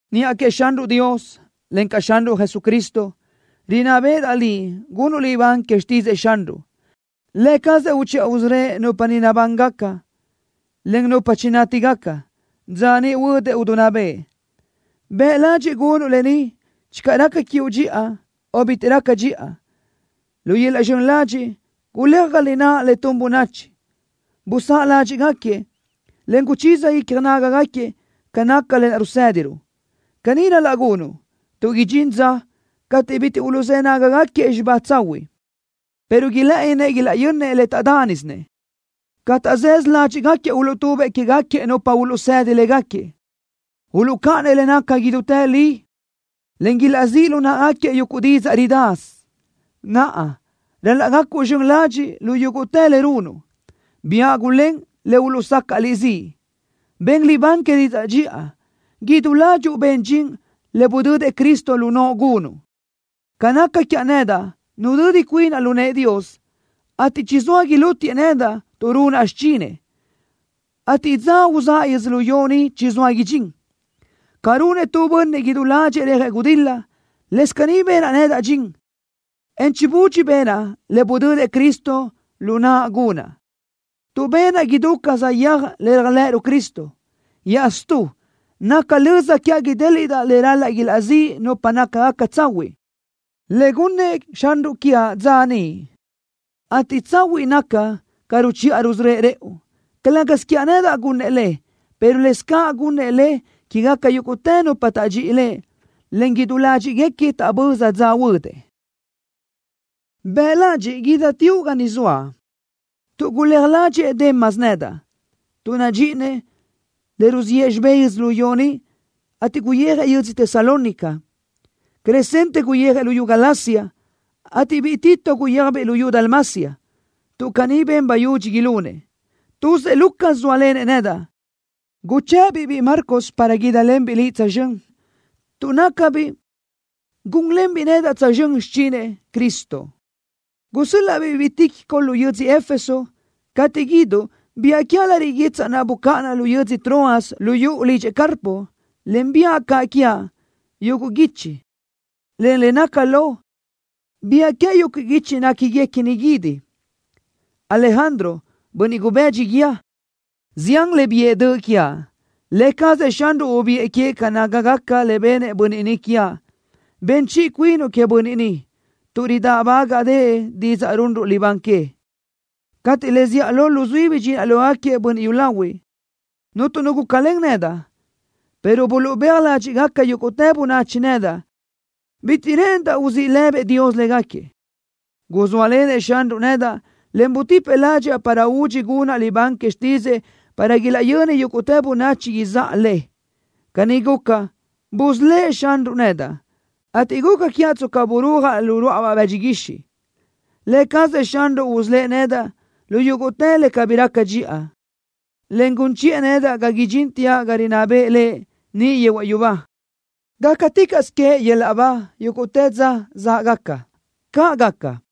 Niʼa queëʼ Xanruʼ Dios, encaʼ Xanruʼ Jesucristo, rinná béʼedaʼ liʼ gunuʼ libán que xtídzëʼë Xanruʼ. Lë cazëʼ uchiʼa usörö́ëʼ nupa ni nabángaca, en nupa chinátigaca, dza niʼ huödëʼ idinná bëʼë. Bëʼ ladxiʼ gunuʼ lë ni channö raca dxiʼa quiuʼ o bitiʼ raca dxiʼa. Lu yöl-laʼ zxön ladxiʼ, guléaj ga lináʼ le tun bönachi. Busáʼ ládxiʼgaquiëʼ, en guchiza icja nágagaquiëʼ ca naca lë naʼ rusédiruʼ. Caní ral-laʼ gunuʼ tuʼ idxín dza cateʼ bitiʼ uluʼzë́ nágagaquiëʼ xibá tsahuiʼ, pero ilë́ʼëninëʼ ilaʼyönnëʼ le taʼdánisinëʼ. Ca taʼzësö ládxiʼgaquiëʼ uluʼtubëʼ quégaquiëʼ nupa uluʼsedi légaquiëʼ. Uluʼcáʼanëʼ le naca idútë li, en ilaʼzíʼ lu náʼagaquiëʼ yuguʼ didzaʼ ridasö. Naʼa, ral-laʼ gacuʼ zxön ladxiʼ lu yúguʼtë le runuʼ. Biáʼ gulén le uluʼsacaʼ liʼ ziʼ. Ben libán que didzaʼ dxiʼa. Idú ládxuʼu ben dxin le budödëʼ Cristo lu noʼo gunuʼ. Ca naca quiaʼ nedaʼ, nudödi cuinaʼ lu nëʼë Dios, ateʼ chizóa ilútiëʼ nedaʼ tuʼ runaʼ xichinëʼ, ateʼ dza uzáʼa yödzölió ni chizóa idxín. Ca runëʼ tu bönniʼ idú ládxëʼë rejëʼ gudil-la, lëscaʼ caní benaʼ nedaʼ dxin, en chibudxi benaʼ le budödëʼ Cristo lu naʼa gunaʼ, tuʼ benaʼ idú ca saʼyéaj le réajlëʼëruʼ Cristo. Iaʼstú, naca löza quiaʼ idéliʼdaʼ le ral-laʼ ilaʼzíʼ nupa nácagaca tsahuiʼ, le gunnëʼ Xanruʼ quiaʼ dza niʼ, ateʼ tsahuiʼ naca ca ruchiʼa rusörö́ëʼ rëʼu. Calë́gasö quiaʼ nedaʼ gunnëʼ le, pero lëscaʼ gunnëʼ le quégaca yúguʼtë nupa taʼdxíʼi Lëʼ, en idú ládxiʼguequi taʼböza dza huödëʼ. Bëʼ ladxiʼ guídateoʼ ga ni zoaʼ tuʼ guléaj ládxëʼë Demas nedaʼ, tuʼ nadxíʼinëʼ le ruziʼë xibé yödzölió ni, ateʼ guyijëʼ yödzö Tesalónica. Crescente guyijëʼ luyú Galacia, ateʼ biʼi Tito guyéajbiʼ luyú Dalmacia, tuʼ caní ben bayudxi ilunëʼ. Tuzëʼ Lucas zóalenëʼ nedaʼ. Guchë́ʼë-biʼ biʼi Marcos para guídalenbiʼ liʼ tsözxö́n, tuʼ nácabiʼ gúnlenbiʼ nedaʼ tsözxö́n xichinëʼ Cristo. Gusö́l-laʼa-biʼ biʼi Tíquico lu yödzö Éfeso. Cateʼ guíduʼ, biáʼ quiaʼ lariʼ guitsaʼ naʼ bucáʼanaʼ lu yödzö Troas lu yuʼu lidxëʼ Carpo, en biáʼ caʼ quiaʼ yuguʼ guichi, en le naca lo, biáʼ quiaʼ yuguʼ guichi néquiguequini guídi. Alejandro, bönniʼ gubëdxi guíë, zián le biʼë döʼ quiaʼ. Lë cazëʼ Xanruʼ ubiʼë queëʼ ca nácagaca le benëʼ bönniʼ ni quiaʼ. Ben chiʼi cuinuʼ queëʼ bönniʼ ni, tuʼ ridáʼbagaʼdëʼë didzaʼ runruʼ libán que. Cateʼ le zíʼalö luzuí bidxinaʼ lógaquiëʼ bönniʼ yúlahuiʼ, cuntu nu gúcalen nedaʼ, pero buluʼbéaj ládxiʼgaca yúguʼtë bönachi nedaʼ. Bitiʼ rë́ʼëndaʼ uzíʼ lëbëʼ Dios légaquiëʼ. Guzóalenëʼ Xanruʼ nedaʼ, en butipëʼ ládxaʼa para údxi gunaʼ libán que xtídzëʼë para ilaʼyöni yúguʼtë bönachi izáʼa le. Caní guca, busölë́ʼ Xanruʼ nedaʼ, ateʼ guca quiaʼ tsca burúajaʼ lu ruáʼabaʼ bëdxi guixiʼ. Lë cazëʼ Xanruʼ usölë́ʼ nedaʼ lu yúguʼtë le cabí raca dxiʼa, en gun chiʼë nedaʼ ga idxínteaʼ ga rinná bëʼë Lëʼ niʼ yehuaʼ yubá. ¡Gácaticaʼsö queëʼ yöl-laʼ ba yúguʼtë dza záʼgaca! ¡Caʼ gaca!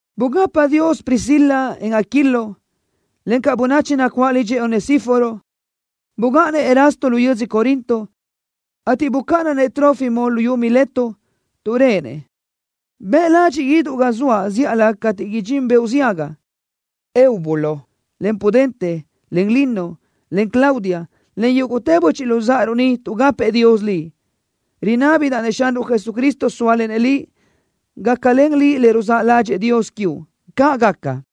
Bugapa Dios Priscila, en Aquilo, encaʼ bönachi nacuáʼ lidxëʼ Onesíforo. Bugáʼanëʼ Erasto lu yödzö Corinto, ateʼ bucáʼanaʼ-nëʼ Trófimo luyú Mileto tuʼ réʼenëʼ. Bëʼ ladxiʼ guíduʼ ga zoaʼ zíʼalö cateʼ idxín beoʼ ziaga. Eubulo, en Pudente, en Lino, en Claudia, en yúguʼtë böchiʼ luzáʼaruʼ ni tuʼgapëʼ Dios liʼ. Rinábidaʼ-nëʼ Xanruʼ Jesucristo sóalenëʼ liʼ. ¡Gácalen liʼ le ruzáʼ ládxëʼë Dios quiuʼ! ¡Caʼ gaca!